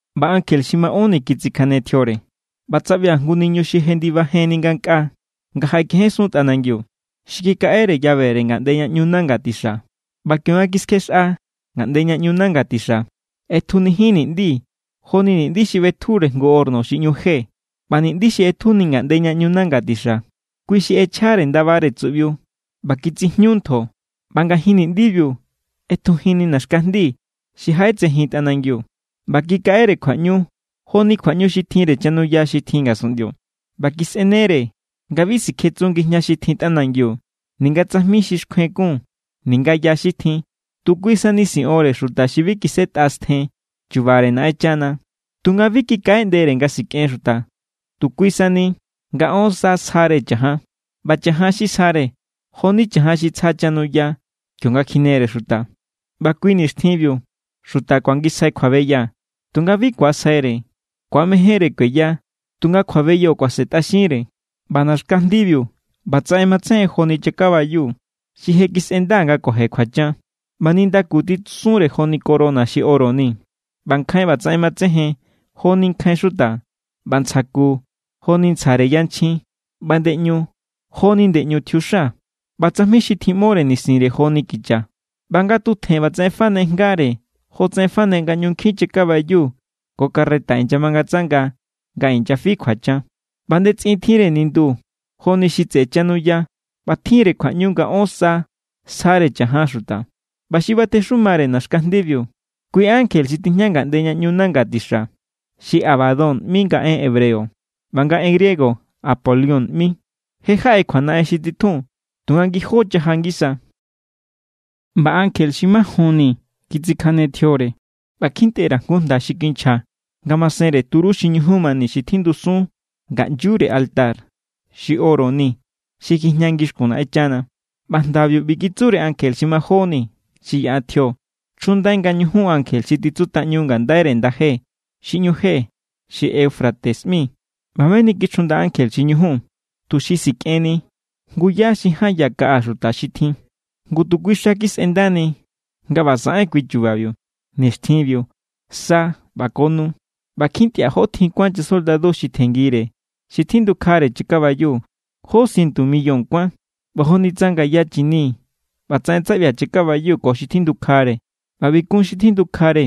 ꞌBa ankje xi maꞌónni kitsikjane tjiore, ꞌba tsaꞌbia̱ jngu niñu xi jendibajenni ngankꞌaa nga jaꞌekejensun tꞌanangiu. Xi kikaꞌere llavere ngaꞌnde ña ꞌñu nanga tixa. ꞌBa kionga kiskjexꞌa ngaꞌnde ña ꞌñu nanga tixa, ꞌetjunijin ni̱ꞌndi joni niꞌndi xi ꞌbetjure jngu horno xi ꞌñu je. ꞌBa niꞌndi xi ꞌetjuni ngaꞌnde ña ꞌñu nanga tixa, kui xi ꞌechjare ndabare tsuꞌbiu ꞌba kitsijñu ntjo. ꞌBa ngajin ni̱ꞌndibiu ꞌetjujinni naxkajndi xi jaꞌetsejin tꞌanangiu. ꞌBa kikaꞌere kjuaꞌñu joni kjuaꞌñu xi tjinre chanuya xi tjin ngasunꞌndio. ꞌBa kisꞌenere nga bi sikjetsun ngijña xi tjin tꞌanangiu ninga tsajmi xi xkjuen kun ninga ya xi tjin. Tu kui sani siꞌonre xuta xi bi kisꞌetꞌa stjen chu̱ba̱re Naꞌenchana. Tunga bi kikaꞌeꞌndere nga sikꞌen xuta, tu kui sani nga ón sa sjare cha̱jan. ꞌBa cha̱jan xi sjare, jo=ni cha̱jan xi tsja chanuya kionga kjinere xuta. ꞌBa kui nixtjinbiu xuta kuangisjai kjuabeya, tunga bi ku̱asjaire. Ku̱amejénre kueya, tunga kjuabeyo kuasentꞌaxinre. ꞌBa naxkajndibiu ꞌbatsaꞌen matsejen joni chakabayu xi je kisꞌenda nga kuaje kjuachan. ꞌBa nindaku titsusunre joni corona xi oro ni, ꞌba nkjain ꞌbatsaꞌen matsejen joni nkjain xuta. ꞌBa ntsja ku, jo=ni ntsjare yanchjin. ꞌBa ndeꞌñu jo=ni ndeꞌñu tjiuxa. ꞌBa tsajmi xi tjiꞌmore nisinre jo=ni kicha. ꞌBa nga tutjen ꞌbatsaꞌen fane jngare jotsaꞌen fane nga ꞌñu nkjin chakabayu ko carreta inyamangatsanga nga inyafi kjuachan. ꞌBa ndetsꞌin tjinre nindu joni xi tseꞌe chanuya ꞌba tjin=re kjuaꞌñu nga ón sa sjare cha̱jan xuta. ꞌBa xi batexumare naxkajndibiu, kui= ankje xi tijña ngaꞌnde ña ꞌñu nanga tixa. Xi Abadón ꞌmi nga en hebreo, ꞌba nga en griego Apolión ꞌmi. Je= jaꞌa kjuanaꞌen xi titjun, tunga ngijó chaja ngisa. ꞌBa ankje xi majonni kitsikjane tjiore, ꞌba kjintꞌe_ra̱ jngu jnda xi kinchja ngamasenre turú xi ñujun mani xi tjindusun ngaꞌnyure altar xi oro ni xi kjijña ngixkun Naꞌenchana. ꞌBa jndabiu ꞌbi kitsure ankje xi majonni xi yaꞌa tjio: “Chjundai nga ñujun ankje xi tjitsutꞌaꞌñu ngandaire ndaje xi ꞌñu je xi Eufrates ꞌmi.” ꞌBa meni kichjunda ankje xi ñujun, tuxi sikꞌenni jngu yá xi ján ya kaꞌa xuta xi tjin. Ngu tu kui xa kisꞌendani nga ꞌba saꞌen kui chubabiu, nixtjinbiu, sa ꞌba ko nu. ꞌBa kjintꞌia̱ jó tjin kuán chasoldadu xi tjenngire xi tjindukjare chakabayu: jó sientu millón kuán. ꞌBa joni tsa ngaya chini ꞌbatsaꞌen tsaꞌbia̱ chakabayu ko xi tjindukjare. ꞌBa ꞌbi kun xi tjindukjare: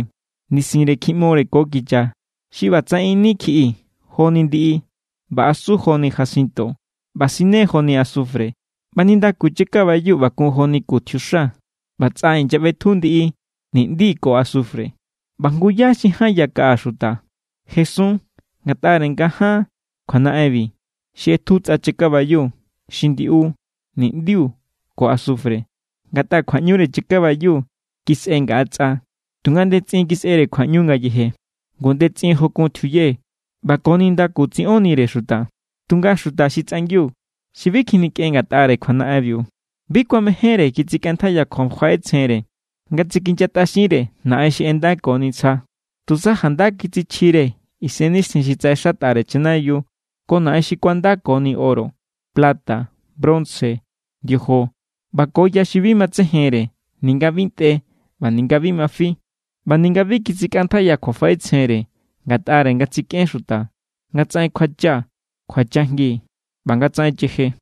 nisinre kjiꞌmore ko kicha xi ꞌbatsaꞌen ini kjiꞌi joni ndiꞌi, ꞌba asu joni jacinto, ꞌba sine joni asufre. ꞌBa nindaku chakabayu ꞌba kun joni ku tjiuxa. ꞌBa tsꞌa inyaꞌbetju ndiꞌi, ni̱ꞌndi ko asufre. ꞌBa jngu yá xi ján ya kaꞌa xuta jesun ngatꞌare nga ján kjuanaꞌenbi xi ꞌetju tsꞌa chakabayu, xi ndiꞌu, niꞌndiu ko asufre. Ngatꞌa kjuaꞌñure chakabayu kisꞌe ngaꞌa tsꞌa, tunga ndetsꞌin kisꞌere kjuaꞌñu ngayeje. Ngu ndetsꞌin jo kun tjiuye, ꞌba ko nindaku tsiꞌonnire xuta. Tunga xuta xi tsꞌangiu, xi bi kjinikꞌen ngatꞌare kjuanaꞌenbiu, bi kuamejénre kitsikꞌantjaiya kjuafaꞌetsjenre nga tsikinyatꞌaxinre naꞌen xi ꞌendakoni ntsja. Tusa janda kitsichjire isennixtjin xi tsaꞌexatꞌare chanayiu ko naꞌen xi kuandakoni oro, plata, bronce, ndiojo ꞌba ko ya xi bi matsejenre ninga bi ntꞌe ꞌba ninga bi ma fi. ꞌBa ninga bi kitsikꞌantjaiya kjuafaꞌetsjenre ngatꞌare nga tsikꞌen xuta, nga tsaꞌen kjuacha, kjuachajngi ꞌba nga tsaꞌen cheje.